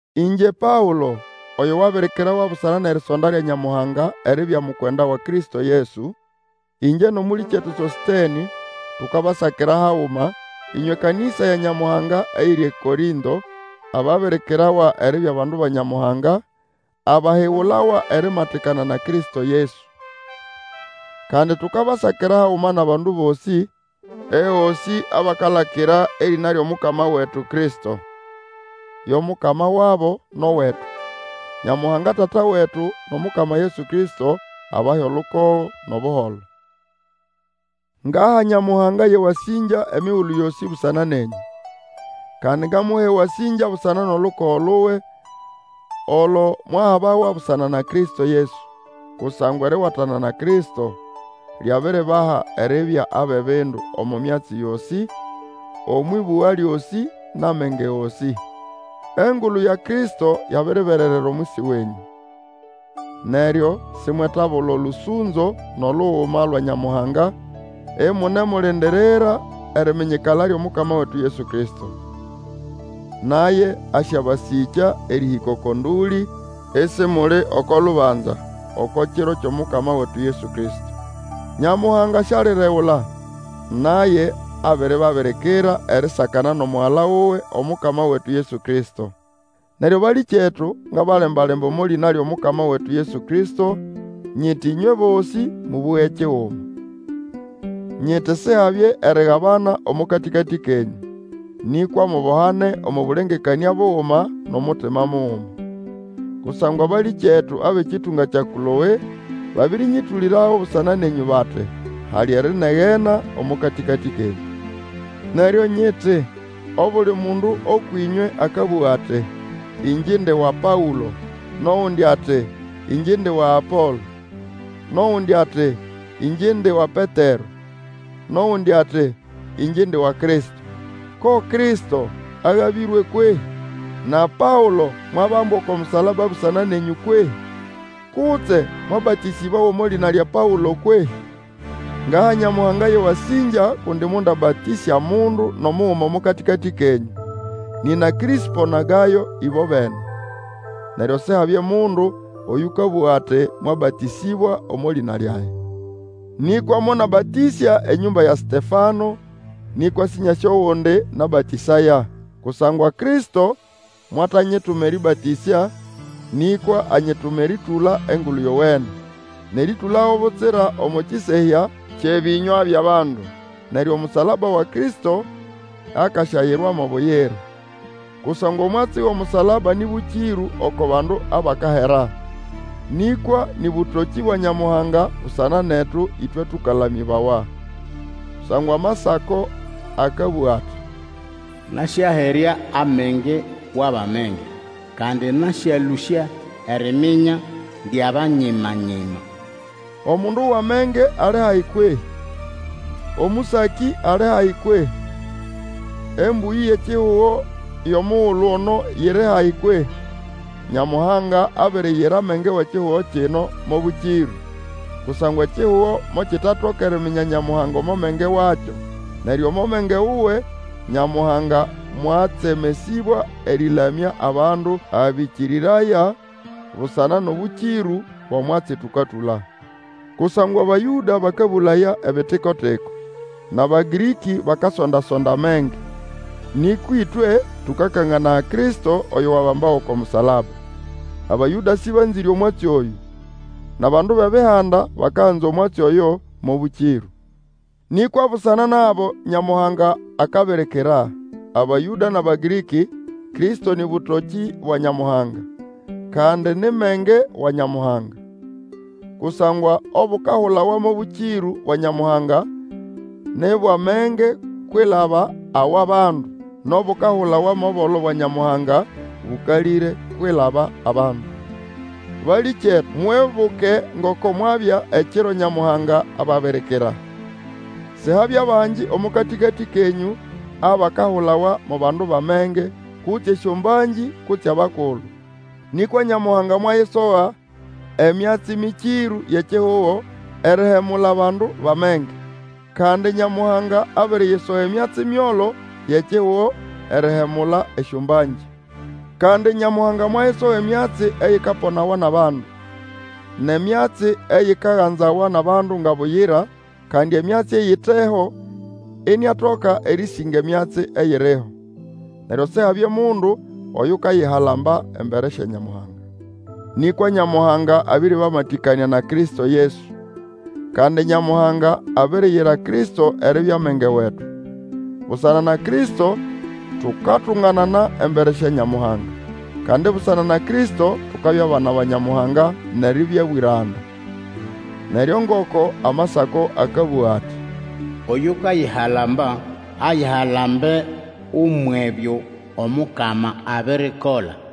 Ĩngye Paũlo, oyo wabirikirawa busana nʼerisonda lya Nyamuhanga eribya mukwenda wa Kristo Yesu. Ĩngye nʼomũlĩkyetu Sosĩtenĩ, tukabasakira haguma, ĩnywe kanĩsa ya Nyamuhanga eyiri eKorĩnto, ababirikirawa eribya bandu ba Nyamuhanga, abahigulawa erimatikana na Kristo Yesu. Kandi tukabasakira haguma nʼabandu bosĩ ehosĩ abakalakira erĩna lyʼomukama wetu Kristo. Yo Mukama wabo nʼowetu. Nyamuhanga Tata wetu nʼomukama Yesu Kristo abahe olukogo nʼobuholo. Ngaha Nyamuhanga yʼewasĩngya emigulu yosĩ busana nenyũ. Kandi ngamuha ewasĩngya busana nʼolukogo luwe, olo mwahabawa busana na Kristo Yesu. Kusangwa eriwatana na Kristo lyabiribaha eribya abʼebindu omo myatsi yosĩ, omwʼĩbũga lyosĩ, nʼamenge gosĩ. Engulu ya Kristo yabiribererera omwisi wenyũ, neryo simwetabula olũsũnzo nʼoluguma lwa Nyamuhanga, imunemulindirira eriminyikala lyʼomukama wetu Yesu Kristo. Naye asyabasĩkya erĩhĩka oko ndũlĩ, isimuli oko lubanza oko kiro kyʼomukama wetu Yesu Kristo. Nyamuhanga sialiregula, naye abiribabirikira erisakana nʼomugala wuwe, Omukama wetu Yesu Kristo. Neryo balĩkyetu, ngabalemba-lemba omo lĩna lyʼomukama wetu Yesu Kristo, nyiti ĩnywe bosĩ mũbũge kiguma. Nyiti Sihabye erigabana omo katĩkatĩ kenyũ, nĩkwa mubohane omo bũlengekanĩa buguma nʼomutima muguma. Kusangwa abalĩkyetu abʼekĩtũnga kya Kloe, babĩrĩnyĩtũlĩrago busana nenyũ bati, hali erinegena omo katĩkatĩ kenyũ. Neryo nyiti, obuli mundu ũkwʼĩnywe akabũga ati, Ĩngye indi wa Paũlo, nʼogundi ati, Ĩngye indi wa Apolo, nʼogundi ati, Ĩngye indi wa Petero, nʼogundi ati, Ĩngye indi wa Kristo. Ko Kristo agabĩrwe kwehĩ? Na Paũlo mwabambwa oko musalaba busana nenyũ kwehĩ? Kutse mwabatĩsĩbawa omo lĩna lya Paũlo kwehĩ? Ngaha Nyamuhanga yʼewasĩngya kundi mondabatĩsya mundu nʼomuguma omo katĩkatĩ kenyũ, nina Krĩspo na Gayo, ĩbobene. Neryo Sihabye mundu oyũkabũga ati mwabatĩsĩbawa omo lĩna lyage. Nĩkwa monabatĩsya enyũmba ya Setefano, nĩkwa Sĩnyasĩ ogundi nabatĩsaya. Kusangwa Kristo mwatanyituma erĩbatĩsya, nĩkwa anyituma erĩtũla Engulu Yowene. Nʼerĩtũlago butsira omo kĩsehya kyʼebĩnywa byʼabandu, neryo omusalaba wa Kristo akasyayirwa mo buyira. Kusangwa omwatsi wʼomusalaba nĩ bũkĩrũ oko bandu abakahera, nĩkwa nĩ bũtokĩ bwa Nyamuhanga busana netu, ĩtwe tũkalamĩbawa. Kusangwa Amasako akabũga ati, Nasyaherya amenge wʼabʼamenge, Kandi nasyalũsya eriminya lyʼabanyima-nyima. Omundu wʼamenge ali hahi kwehĩ? Omũsakĩ ali hahi kwehĩ? Embũyĩ yʼekihugo yʼomugulu ono yiri hahi kwehĩ? Nyamuhanga abiriyira amenge wʼekihugo kino mo bũkĩrũ. Kusangwa ekihugo mokitetatoka eriminya Nyamuhanga omo menge wakyo. Neryo omo menge wuwe Nyamuhanga mwatsemesĩbwa erĩlamya abandu abakĩkĩrĩraya busana nʼobũkĩrũ bwʼomwatsi tũkatũla. Kusangwa Abayũda bakabũlaya ebitiko-tiko, nʼAbagĩrĩkĩ bakasonda-sonda amenge; nĩkwa ĩtwe tũkakanganaya Kristo oyo wabambawa oko musalaba. Abayũda sĩbanzĩre omwatsi oyũ, nʼabandu bʼEbihanda bakaganza omwatsi oyo mo bũkĩrũ. Nĩkwa busana nʼabo Nyamuhanga akabirikira, Abayũda nʼAbagĩrĩkĩ, Kristo nĩ bũtokĩ bwa Nyamuhanga, kandi, ni menge wa Nyamuhanga. Kusangwa obukahulawa mo bũkĩrũ bwa Nyamuhanga, ni bwʼamenge kwilaba awʼabandu, nʼobukahulawa mo bolo bwa Nyamuhanga, bũkalĩre kwilaba abandu. Balĩkyetu, mwibuke ngoko mwabya ekiro Nyamuhanga ababirikira. Sihabya bangi omo katĩkatĩ kenyũ abakahulawa mo bandu bʼamenge, kutse esyombangĩ, kutse abakulu. Nĩkwa Nyamuhanga mwayisoga emyatsi mĩkĩrũ yʼekihugo erihemula abandu bʼamenge. Kandi Nyamuhanga abiriyisoga emyatsi myolo yʼekihugo erihemula esyombangĩ. Kandi Nyamuhanga mwayisoga emyatsi eyikaponawa nʼabandu, nʼemyatsi eyikaganzawa nʼabandu nga buyira, kandi emyatsi eyiteho, iniatoka erĩsĩnga emyatsi eyiriho. Neryo Sihabye mundu oyukayihalamba embere sya Nyamuhanga. Nĩkwa Nyamuhanga abĩrĩbamatĩkanĩa na Kristo Yesu. Kandi Nyamuhanga abiriyira Kristo eribya menge wetu. Busana na Kristo tukatunganana embere sya Nyamuhanga, kandi busana na Kristo tukabya bana ba Nyamuhanga, nʼeribya bwĩranda. Neryo ngoko Amasako akabũga ati, Oyukayihalamba, ayihalambe umwʼebyo Omukama abirikola.